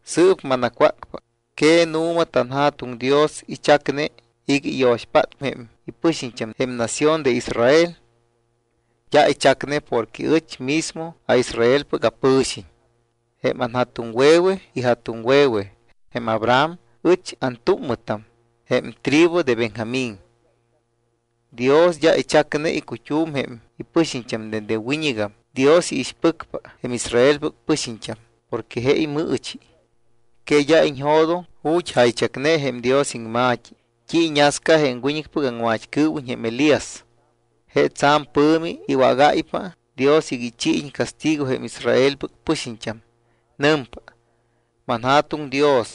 Sɨɨp manacwácpa. ¿Que nu̱ma tanJa̱tuŋ Dios ichacne iga iyo̱xpátpa jém ipɨxiñt́am jém nación de Israel? D́a ichacne porque ɨch mismo aIsraelpɨc apɨ̱xiñ. Jém anja̱tuŋwe̱we ija̱tuŋwe̱we jém Abraham. Ɨch antúmmɨtam jém tribu de Benjamín. Dios d́a ichacne icut́um jém ipɨxiñt́am. Dende wiñɨgam Dios iixpɨcpa jém Israelpɨc pɨxiñt́am porque je imɨɨchi. ¿Que d́a iñjo̱doŋ ju̱t́ jaychacne jém Dios iŋma̱t́i t́i iñasca jém wiñɨcpɨc aŋmat́cɨɨwiñ jém Elías? Je tsa̱m pɨ̱mi iwágáypa Dios iga ichiiñ castigo jém Israelpɨc pɨxiñt́am. Nɨmpa: “ManJa̱tuŋ Dios,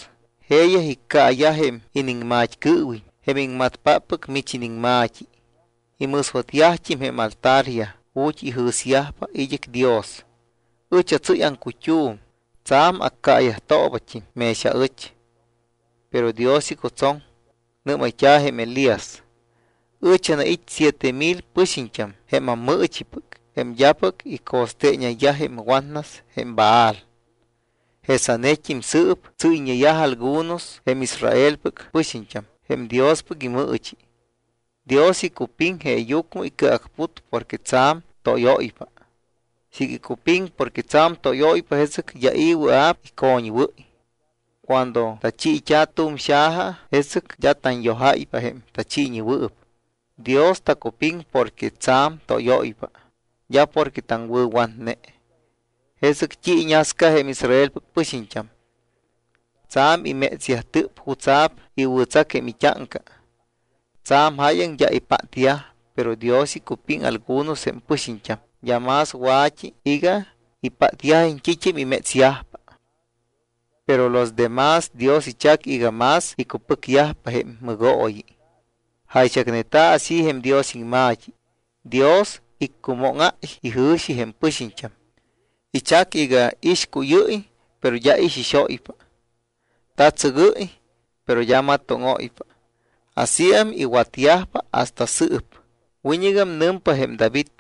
jeeyaj iccaayaj jém iniŋmat́cɨɨwiñ, jém iŋmatpáppɨc mich iniŋma̱t́i. Imɨswatyajt́im jém altaryaj ju̱t́ ijɨ̱syajpa id́ɨc Dios. Ɨch atsɨ́y aŋcut́um, tsa̱m accaayajtoobat́im mex aɨch.” Pero Dios icutsoŋ. Nɨ́mayt́a̱ jém Elías: “Ɨch anait́ siete mil pɨxiñt́am jém ammɨɨchipɨc jém d́apɨc ico̱steeñayyaj jém watnas jém Baal.” Jesanet́im sɨɨp tsɨ́yñeyaj algunos jém Israelpɨc pɨxiñt́am jém Diospɨc imɨɨchi. Dios icupiŋ, jeeyucmɨ icɨacput porque tsa̱m tóyóypa. Siiga icupiŋ porque tsa̱m tóyóypa, jesɨc d́a i̱ wɨa̱p icoñwɨ́y. Cuando tachiit́a̱ tu̱m xaja, jesɨc d́a tanyojáypa jém tachiiñewɨɨp. Dios tacupiŋ porque tsa̱m tóyóypa, d́a porque taŋwɨ̱watne. ¿Jesɨc t́i iñasca jém Israelpɨc pɨxiñt́am? Tsa̱m imétsyajtɨp jutsa̱p iwɨ̱tsac jém it́áŋca. Tsa̱m jáyaŋ d́a ipátyaj. Pero Dios icupiŋ algunos jém pɨxiñt́am, d́a más wa̱t́i, iga ipátyajiñ t́it́am imétsyajpa. Pero los demás, Dios ichac iga más icupɨcyajpa jém mɨgooyi. Jaychacneta̱ así jém Dios iŋma̱t́i: “Dios iccumóŋáy ijɨ̱xi jém pɨxiñt́am. Ichac iga ixcuyɨ́y, pero d́a ixixóypa. Ta̱tsɨgɨ́y, pero d́a matóŋóypa. Asíam iwatyajpa hasta sɨɨp.” Wiñɨgam nɨmpa jém David: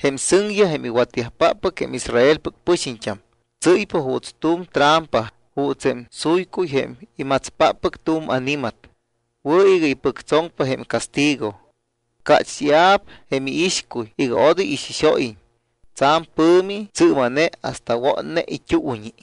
Jém sɨŋyaj, jém iwatyajpáppɨc jém Israelpɨc pɨxiñt́am, tsɨ́ypa juuts tu̱m trampa, juuts jém suycuy jém imatspáppɨc tu̱m ani̱mat. Wɨ̱ iga ipɨctsoŋpa jém castigo. Cácht́ia̱p jém iixcuy iga odoy ixixóyiñ. Tsa̱m pɨ̱mi tsɨɨma̱ne hasta wotne it́uuñi.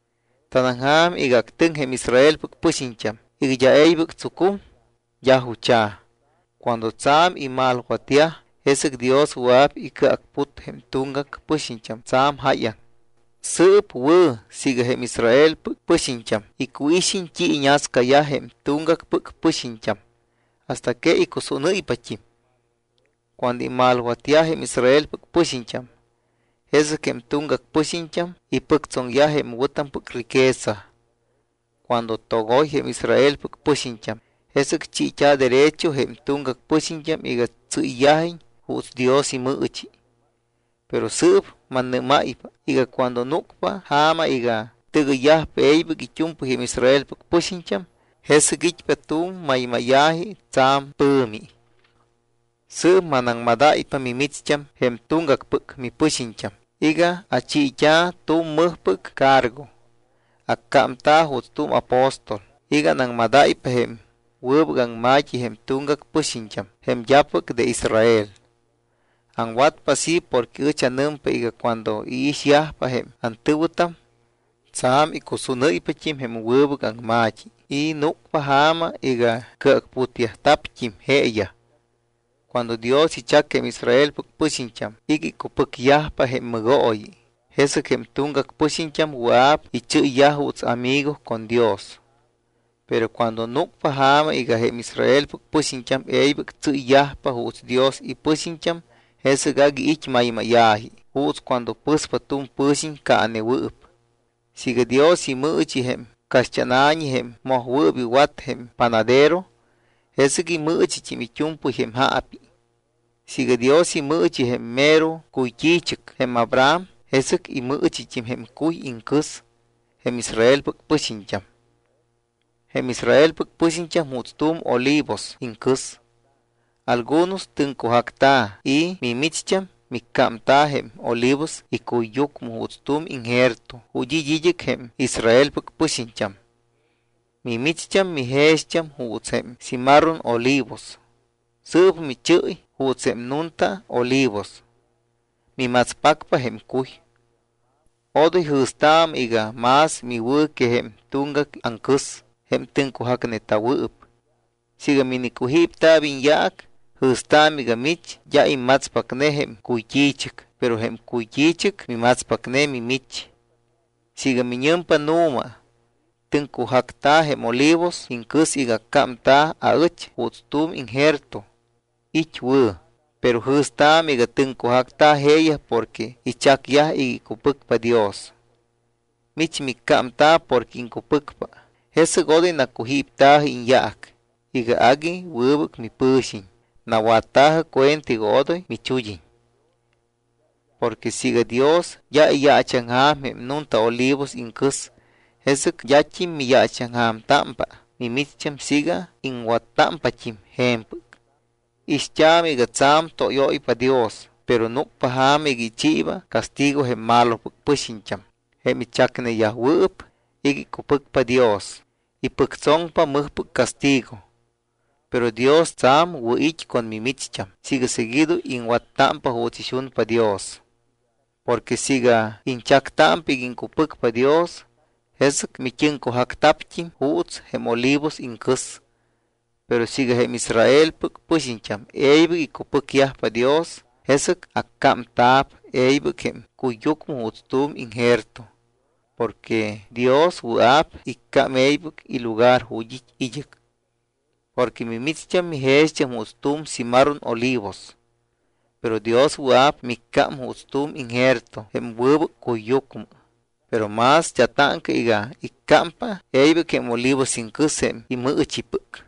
¿Tanaŋja̱m iga actɨŋ jém Israelpɨc pɨxiñt́am iga d́a e̱ybɨc tsucum? D́a jucha̱. Cuando tsa̱m imalwatyaj, jesɨc Dios wɨa̱p icɨacput jém tuŋgac pɨxiñt́am tsa̱m jáyaŋ. Sɨɨp wɨ̱ siiga jém Israelpɨc pɨxiñt́am icuixiñ t́i iñascayaj jém tuŋgacpɨc pɨxiñt́am hasta que icusúnɨ́ypat́im. Cuando imalwatyaj jém Israelpɨc pɨxiñt́am, jesɨc jém tuŋgac pɨxiñt́am ipɨctsoŋyaj jém wɨ̱tampɨc riqueza. Cuando togoy jém Israelpɨc pɨxiñt́am, jesɨc chiit́a̱ derecho jém tuŋgac pɨxiñt́am iga tsɨ́yyajiñ juuts Dios imɨɨchi. Pero sɨɨp mannɨ́máypa iga cuando núcpa ja̱ma iga tɨgɨyyajpa e̱ybɨc it́u̱mpɨy jém Israelpɨc pɨxiñt́am, jesɨc it́pa tu̱m maymáya̱ji tsa̱m pɨ̱mi. Sɨɨp manaŋmadáypa mimicht́am, jém tuŋgacpɨc mipɨxiñt́am, iga achiit́a̱ tu̱m mɨjpɨc cargo. Accámta̱ juuts tu̱m apóstol iga anaŋmadáypa jém wɨbɨc aŋma̱t́i jém tuŋgac pɨxiñt́am, jém d́apɨc de Israel. Aŋwatpa así porque ɨch anɨmpa iga cuando iixyajpa jém antɨ̱wɨtam, tsa̱m icusúnɨ́ypat́im jém wɨbɨc aŋma̱t́i y núcpa ja̱ma iga cɨacputyajta̱pt́im jeeyaj. Cuando Dios ichac jém Israelpɨc pɨxiñt́am iga icupɨcyajpa jém mɨgooyi, jesɨc jém tuŋgac pɨxiñt́am wɨa̱p ichɨ́yyaj juuts amigo con Dios. Pero cuando núcpa ja̱ma iga jém Israelpɨc pɨxiñt́am e̱ybɨc tsɨ́yyajpa juuts Dios ipɨxiñt́am, jesɨc agui it́ maymáya̱ji juuts cuando pɨ̱spa tu̱m pɨ̱xiñ caanewɨɨp. Siiga Dios imɨɨchi jém caxt́ána̱ñi jém mojwɨɨp iwat jém panadero, jesɨc imɨɨchit́im it́u̱mpɨy jém jaapi. Siiga Dios imɨɨchi jém mero cuyt́i̱chɨc, jém Abraham, jesɨc imɨɨchit́im jém cuy iŋcɨs jém Israelpɨc pɨxiñt́am. Jém Israelpɨc pɨxiñt́am juuts tu̱m olivos iŋcɨs. Algunos tɨŋcujacta̱ y mimicht́am micámta̱ jém olivos icuyyucmɨ juuts tu̱m injerto ju̱t́ it́ id́ɨc jém Israelpɨc pɨxiñt́am. Mimicht́am mijext́am juuts jém cimarrón olivos. Sɨɨp michɨ́y juuts jém nunta olivos. Mimatspacpa jém cuy. Odoy jɨ̱staamɨ iga más miwɨ̱ que jém tuŋgac aŋcɨs jém tɨŋcujacneta̱wɨɨp. Siiga minicujípta̱p iñyaac, jɨ̱staamɨ iga mich d́a immatspacne jém cuyt́i̱chɨc, pero jém cuyt́i̱chɨc mimatspacne mimich. Siiga miñɨmpa: “Nu̱ma, tɨŋcujacta̱ jém olivos iŋcɨs iga accámta̱p aɨch juuts tu̱m injerto”, it́ wɨ̱. Pero jɨ̱staamɨ iga tɨŋcujacta̱ jeeyaj porque ichacyaj iga icupɨcpa Dios. Mich miccámta̱ porque iŋcupɨcpa. Jesɨc odoy nacujípta̱jɨ iñyaac iga agui wɨbɨc mipɨ̱xiñ. Nawatta̱jɨ cuenta iga odoy michud́iñ. Porque siiga Dios d́a iyaachaŋja̱m jém nunta olivos iŋcɨs, jesɨc d́at́im miyaachaŋja̱mtámpa mimicht́am siiga iŋwattámpat́im je̱mpɨc. Ixt́aamɨ iga tsa̱m tóyóypa Dios, pero núcpa ja̱ma iga ichiiba castigo jém malopɨc pɨxiñt́am. Jém ichacneyajwɨɨp iga icupɨcpa Dios ipɨctsoŋpa mɨjpɨc castigo, pero Dios tsa̱m wɨ̱ it́ con mimicht́am siiga seguido iŋwattámpa juuts ixunpa Dios. Porque siiga iñchactámpa iga iŋcupɨcpa Dios, jesɨc mit́ɨŋcujacta̱pt́im juuts jém olivos iŋcɨs. Pero siiga jém Israelpɨc pɨxiñt́am e̱ybɨc icupɨcyajpa Dios, jesɨc accámta̱p e̱ybɨc jém cuyyucmɨ juuts tu̱m injerto. Porque Dios wɨa̱p iccám e̱ybɨc ilugar ju̱t́ it́ id́ɨc. Porque mimicht́am mijext́am juuts tu̱m cimarrón olivos. Pero Dios wɨa̱p miccám juuts tu̱m injerto jém wɨbɨc cuyyucmɨ. Pero más d́a táŋca iga iccámpa e̱ybɨc jém olivos iŋcɨs jém imɨɨchipɨc.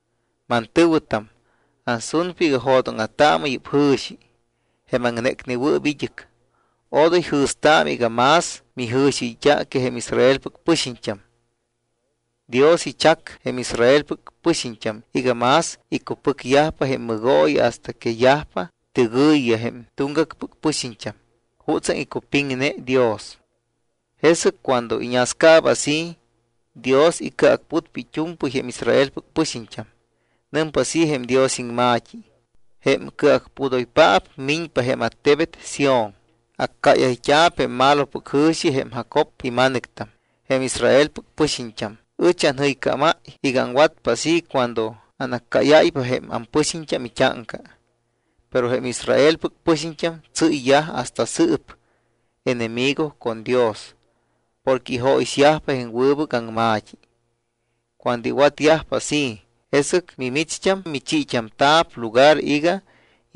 Mantɨ̱wɨtam, ansunpa iga jo̱dóŋa̱taamɨ yɨ́p jɨ̱xi jém aŋnécnewɨɨp id́ɨc. Odoy jɨ̱staamɨ iga más mijɨ̱xiɨyt́a que jém Israelpɨc pɨxiñt́am. Dios ichac jém Israelpɨc pɨxiñt́am iga más icupɨcyajpa jém mɨgooyi hasta que yajpa tɨgɨ̱yiyaj jém tuŋgacpɨc pɨxiñt́am jutsaŋ icupiŋne Dios. Jesɨc cuando iñascaaba así, Dios icɨacputpa it́u̱mpɨy jém Israelpɨc pɨxiñt́am. Nɨmpa así jém Dios iŋma̱t́i: Jém Cɨacpudoypaap miñpa jém attebet Sión. Accáyayt́a̱p jém malopɨc jɨ̱xi jém Jacob ima̱nɨctam, jém Israelpɨc pɨxiñt́am. Ɨch anjɨycámáy iga aŋwatpa así cuando anaccáyáypa jém ampɨxiñt́am it́áŋca. Pero jém Israelpɨc pɨxiñt́am tsɨ́yyaj hasta sɨɨp enemigo con Dios porque ijóyixyajpa jém wɨbɨc aŋma̱t́i. Cuando iwatyajpa así, jesɨc mimicht́am michiit́amta̱p lugar iga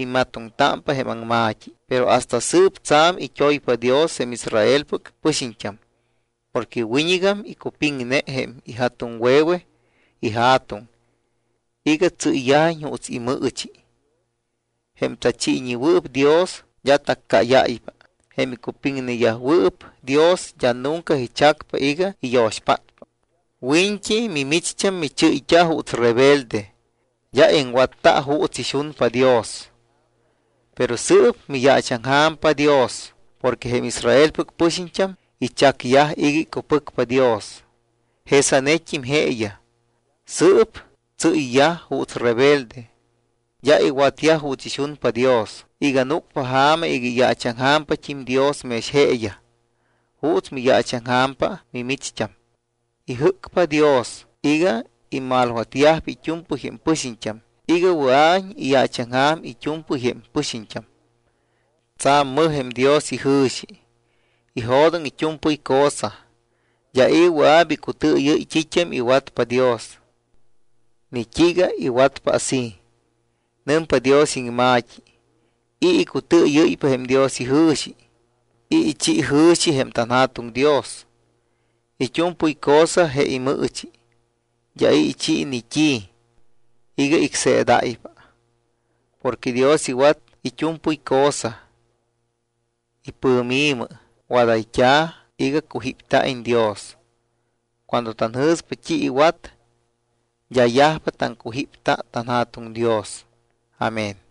immatoŋtámpa jém aŋma̱t́i. Pero hasta sɨɨp tsa̱m it́oypa Dios jém Israelpɨc pɨxiñt́am porque wiñɨgam icupiŋne jém ija̱tuŋwe̱we ija̱tuŋ iga tsɨ́yyajiñ juuts imɨɨchi. Jém tachiiñewɨɨp Dios d́a taccáyáypa. Jém icupiŋneyajwɨɨp Dios d́a nunca ichacpa iga iyo̱xpátpa. Wiñt́i mimicht́am michɨ́yt́a juuts rebelde, d́a iŋwatta juuts ixunpa Dios, pero sɨɨp miyaachaŋja̱mpa Dios porque jém Israelpɨc pɨxiñt́am ichacyaj iga icupɨcpa Dios. Jesanet́im jeeyaj sɨɨp tsɨ́yyaj juuts rebelde, d́a iwatyaj juuts ixunpa Dios iga núcpa ja̱ma iga iyaachaŋja̱mpat́im Dios mex jeeyaj juuts miyaachaŋja̱mpa mimicht́am. Ijɨ́cpa Dios iga imalwatyajpa it́u̱mpɨy jém pɨxiñt́am iga wɨa̱iñ iyaachaŋja̱m it́u̱mpɨy jém pɨxiñt́am. Tsa̱m mɨj jém Dios ijɨ̱xi. Ijo̱doŋ it́u̱mpɨy cosa. D́a i̱ wɨa̱p icutɨɨyɨ́y t́it́am iwatpa Dios ni t́iiga iwatpa así. Nɨmpa Dios iŋma̱t́i: ¿I̱ icutɨɨyɨ́ypa jém Dios ijɨ̱xi? ¿I̱ ichi jɨ̱xi jém tanJa̱tuŋ Dios? It́u̱mpɨy cosa je imɨɨchi. D́a i̱ ichi ni t́i iga icseedáypa. Porque Dios iwat it́u̱mpɨy cosa. Ipɨ̱mi̱mɨ wadayt́a̱ iga cujípta̱iñ Dios. Cuando tanjɨ̱spa t́i iwat, d́a yajpa taŋcujíptámpa tanJa̱tuŋ Dios. Amén.